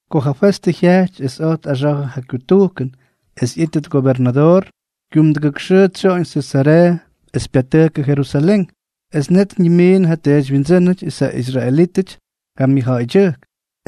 Ko ja Festʉ jyajty es oj tꞌaxa̱jʉ ja kyutujkʉn es ꞌyítʉt gobernadoor, kyumdʉgʉk xʉʉ tsyoꞌoñ Sesareeʉ es pyatʉjkʉ Jerusalén. Es net ñimiinʉdʉ ja teedywyindsʉ́nʉty es ja israelítʉty ja myʉjja̱ꞌa̱ydyʉjk,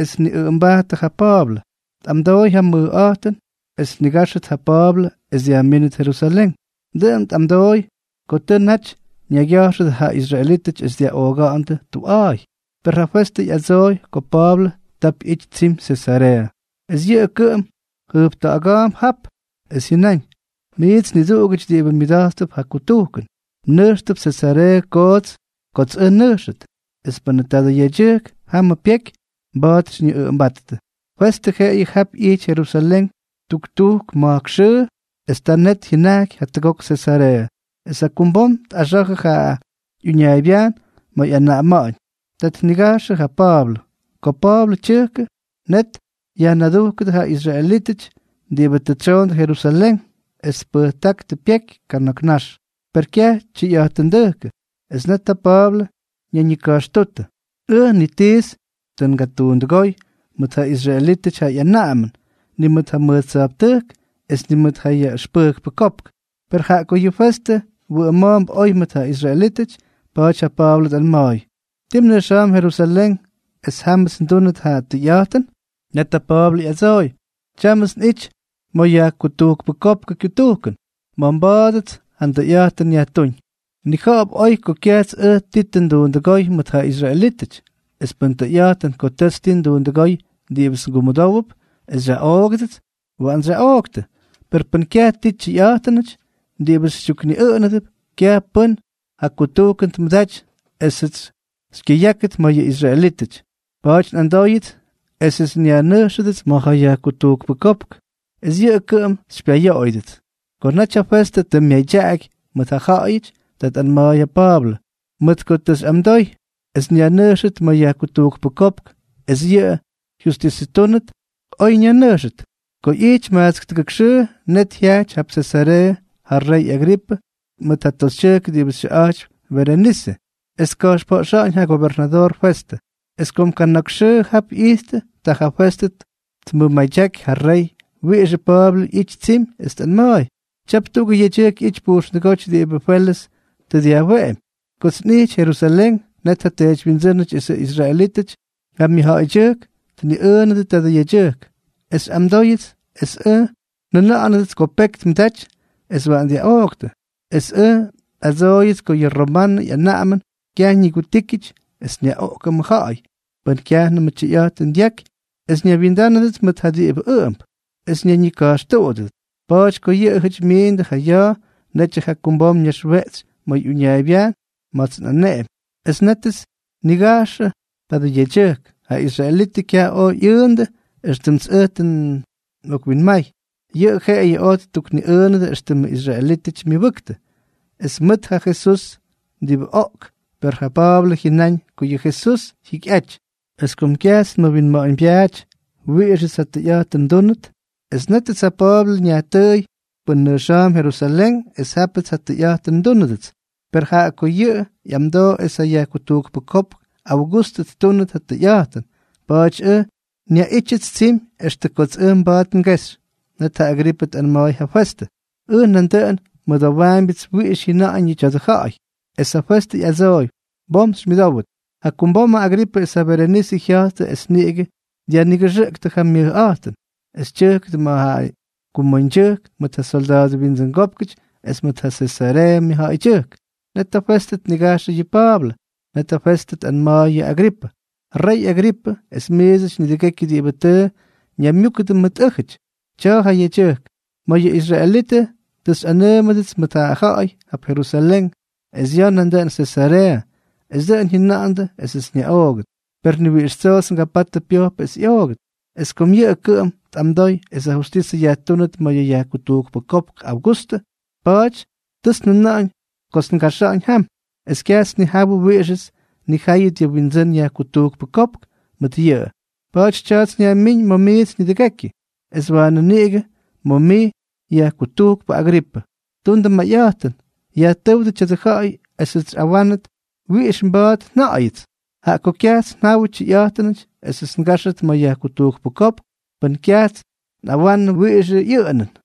es tniꞌʉꞌʉmbajttʉ ja Pa̱a̱blʉ, tꞌamdooy ja mayꞌa̱jtʉn es tnigáxʉt ja Pa̱a̱blʉ es dyajmínʉt Jerusalén. Dʉꞌʉn tꞌamdooy ko tʉ naty ñaygya̱jxʉdʉ ja israelítʉty es dyaꞌooga̱ꞌa̱ndʉ tuꞌa̱a̱y. Per ja Festʉ ꞌyadsooy ko Pa̱a̱blʉ tap ꞌyity tsimy Sesareeʉ, es yʉꞌʉ kʉꞌʉm jʉjpta̱ꞌa̱ga̱a̱mp jap. Es jyʉnáñ: —Miits niduꞌugʉty diꞌibʉ myʉda̱jttʉp ja kutujkʉn, mnʉjxtʉp Sesareeʉ kots ʉj nnʉjxʉt, es pʉnʉ tadʉ yedyʉjk jamʉ pyeky, mba̱a̱t xyñiꞌʉꞌʉmbáttʉ. Festʉ jeꞌeyʉ jap ꞌyijty Jerusalén tuktujk ma̱jk xʉʉ es ta net jyʉnajky jatʉgok Sesareeʉ. Es jakumbom tꞌaxa̱jʉ ja ꞌyuñaaybyajn ma̱ ꞌyanaꞌama̱ꞌa̱ñ. Ta tnigajxʉ ja Pa̱a̱blʉ. Ko Pa̱a̱blʉ tyʉjkʉ, net yajnadujkʉdʉ ja israelítʉty diꞌibʉ tʉ tsyoondʉ Jerusalén, es tpʉjtákʉdʉ pyeky kana̱k nax, per kyaj tyʉyꞌa̱jtʉndʉjkʉ. Es net ja Pa̱a̱blʉ ñayñika̱jxtútʉ: —Ʉj, ni tits tʉ ngatuundʉgóy mʉt ja israelítʉty ja ꞌyanaꞌamʉn, ni mʉt ja mʉj tsya̱jptʉjk es ni mʉt ja yajkutujkpʉ kopk. Per jaꞌa ko yʉ Festʉ wʉꞌʉma̱a̱mp oy mʉt ja israelítʉty, pa̱a̱ty ja Pa̱a̱blʉ tꞌanma̱a̱y: —¿Tii mnʉjxa̱a̱mp Jerusalén es jámʉts ndúnʉt ja tʉyꞌa̱jtʉn? Net ja Pa̱a̱blʉ ꞌyadsooy: —Tyámʉts nꞌity ma̱ yajkutujkpʉ kopkʉ kyutujkʉn, ma̱ mba̱a̱dʉts ja ndʉyꞌa̱jtʉn yajtúñ. Mnija̱ꞌa̱p oy ko kyajts ʉj ti tʉ nduundʉgóy mʉt ja israelítʉty. Es pʉn tʉyꞌa̱jtʉn ko tʉts ti nduundʉgóy diꞌibʉts ngumʉdówʉp es xyaꞌoogʉdʉts, waꞌants xyaꞌooktʉ; per pʉn kyaj ti tyʉyꞌa̱jtʉnʉty diꞌibʉ xytyukniꞌʉꞌʉnʉp, kyaj pʉ́n ja kutujkʉn tmʉdaty esʉts xykyʉyákʉt ma̱ yʉ israelítʉty. Pa̱a̱ty nꞌamdóyʉts esʉts xyajnʉjxʉdʉts ma̱ ja yajkutujkpʉ kopk es yʉꞌʉ kʉꞌʉm xypyayoꞌoyʉdʉts. Ko naty ja Festʉ tʉ myadyaꞌaky mʉt ja jyaꞌayʉty, ta tꞌanma̱a̱y ja Pa̱a̱blʉ: —Mʉt ko tʉ xyꞌamdoy es nyajnʉjxʉt ma̱ yajkutujkpʉ kopk es yʉꞌʉ jyustisʉtúnʉt, oy nyajnʉjxʉt. Ko ꞌyijty majtsk tʉgʉk xʉʉ, net jyajty jap Sesareeʉ ja rey Agripʉ mʉt ja toxytyʉjk diꞌibʉ xyʉꞌa̱jtypy Berenise, es tka̱jxpoꞌxa̱ꞌa̱ñ ja gobernadoor Festʉ. Es kom kana̱k xʉʉ jap ꞌyijttʉ, ta ja Festʉ tmʉmadyaky ja rey wiꞌixʉ Pa̱a̱blʉ ꞌyity tsimy, es tꞌanma̱a̱y: —Tyap tuꞌugʉ yedyʉjk ꞌyity pujxndʉgóty diꞌibʉ Felʉs tʉ dyajweꞌemy. Kots nꞌijty Jerusalén, net ja teedywyindsʉ́nʉty esʉ israelítʉty ja myʉjja̱ꞌa̱ydyʉjk tniꞌʉꞌʉnʉdʉ tadʉ yedyʉjk, es xyꞌamdooyʉts es ʉj njʉna̱ꞌa̱nʉdʉts ko peky tmʉdaty es waꞌan dyaꞌooktʉ. Es ʉj nꞌadsooyʉts ko yʉ romanʉ ꞌyanaꞌamʉn kyaj ñigutíkyʉty es nyaꞌoꞌkʉm ja ja̱ꞌa̱y pʉn kyajnʉmʉ tyʉyꞌa̱jtʉn dyaky es ñaywyindánʉdʉt mʉt ja diꞌibʉ ʉꞌʉmp, es ñayñika̱jxtuꞌudʉdʉt. Pa̱a̱ty ko yʉꞌʉjʉty myiindʉ ja ya̱a̱, netyʉ jakumbom nnaxweꞌtsy ma̱ uñaaybyajn ma̱ts nꞌaneꞌemy, es nétʉts nnigajxʉ tadʉ yedyʉjk. Ja israelítʉty kyaj oj ꞌyʉʉndʉ éxtʉmts ʉj tʉ nꞌokwinmay. Yʉꞌʉ jeꞌeyʉ oj ttukniꞌʉʉnʉdʉ éxtʉmʉ israelítʉty myʉbʉktʉ, es mʉʉt ja Jesús diꞌibʉ oꞌk; per ja Pa̱a̱blʉ jyʉnáñ ko yʉ Jesús jyikyꞌaty. Es kom kyajts nmʉwinma̱ꞌa̱ñbyaaty wiꞌixʉts ja tʉyꞌa̱jtʉn ndúnʉt, nétʉts ja Pa̱a̱blʉ nyajtʉʉy pʉn nʉjxa̱a̱mp Jerusalén es jápʉts ja tʉyꞌa̱jtʉn ndúnʉdʉts. Per jaꞌa ko yʉꞌʉ ꞌyamdoo es ja yajkutujkpʉ kopk Augustʉ ttúnʉt ja tʉyꞌa̱jtʉn, pa̱a̱ty ʉj nyaꞌítyʉts tsimy extʉ kots ʉj mba̱a̱t ngexy. Net ja Agripʉ tꞌanma̱a̱y yʉ Festʉ: —Ʉj nandʉꞌʉn nmʉdowaambyʉts wiꞌix jyʉnaꞌañʉ tadʉ ja̱ꞌa̱y. Es ja Festʉ ꞌyadsooy: —Bom xymyʉdówʉt. Jakumbomʉ Agripʉ es ja Berenise jya̱jttʉ es niꞌigʉ dyajnigʉxʉꞌktʉ ja myʉjꞌa̱jtʉn, es tyʉjkʉdʉ ma̱ ja kumoñdyʉjk mʉt ja solda̱a̱dʉ windsʉngópkʉty es mʉt ja Sesareeʉ myʉjja̱ꞌa̱ydyʉjk. Net yʉ Festʉ tnigajxʉ yʉ Pa̱a̱blʉ. Net ja Festʉ tꞌanma̱a̱y yʉ Agripʉ: —Rey Agripʉ es miidsʉty nidʉgekyʉ diꞌibʉ tʉ ñaymyúkʉdʉ mʉt ʉ́jʉty, tya̱a̱ ja yedyʉjk. Mayʉ israelítʉty tʉ xyꞌanʉʉmʉts mʉt yʉ ja̱ꞌa̱y jap Jerusalén es ya̱a̱ nandʉꞌʉn Sesareeʉ, es dʉꞌʉn jyʉna̱ꞌa̱ndʉ esʉts nyaꞌoogʉt. Per ni wiꞌix tsoots ngapatʉ pyojpʉ es ꞌyoogʉt. Es kom yʉꞌʉ kʉꞌʉm tʉ tꞌamdoy es ja jyustisʉ yajtúnʉt ma̱ yʉ yajkutujkpʉ kopk Augustʉ, pa̱a̱ty tʉts njʉna̱ꞌa̱ñ kots ngaxa̱ꞌa̱ñ jam. Es kyajts nnijawʉ wiꞌixʉts nnijáyʉt yʉ nwindsʉ́n yajkutujkpʉ kopk mʉt yʉꞌʉ. Pa̱a̱ty tya̱a̱ts nyajmíñ ma̱ miits nidʉgekyʉ, es waanʉ niꞌigʉ ma̱ mij, yajkutujkpʉ Agripʉ. Tundʉ mayꞌa̱jtʉn, yajtʉ́wdʉ tya̱dʉ ja̱ꞌa̱y esʉts xyꞌawánʉt wiꞌix mba̱a̱t nja̱ꞌa̱yʉts, jaꞌa ko kyajts njawʉ tyʉyꞌa̱jtʉnʉty esʉts ngáxʉt ma̱ ja yajkutujkpʉ kopk pʉn kyajts nꞌawanʉ wiꞌixʉ ꞌyʉꞌʉnʉn.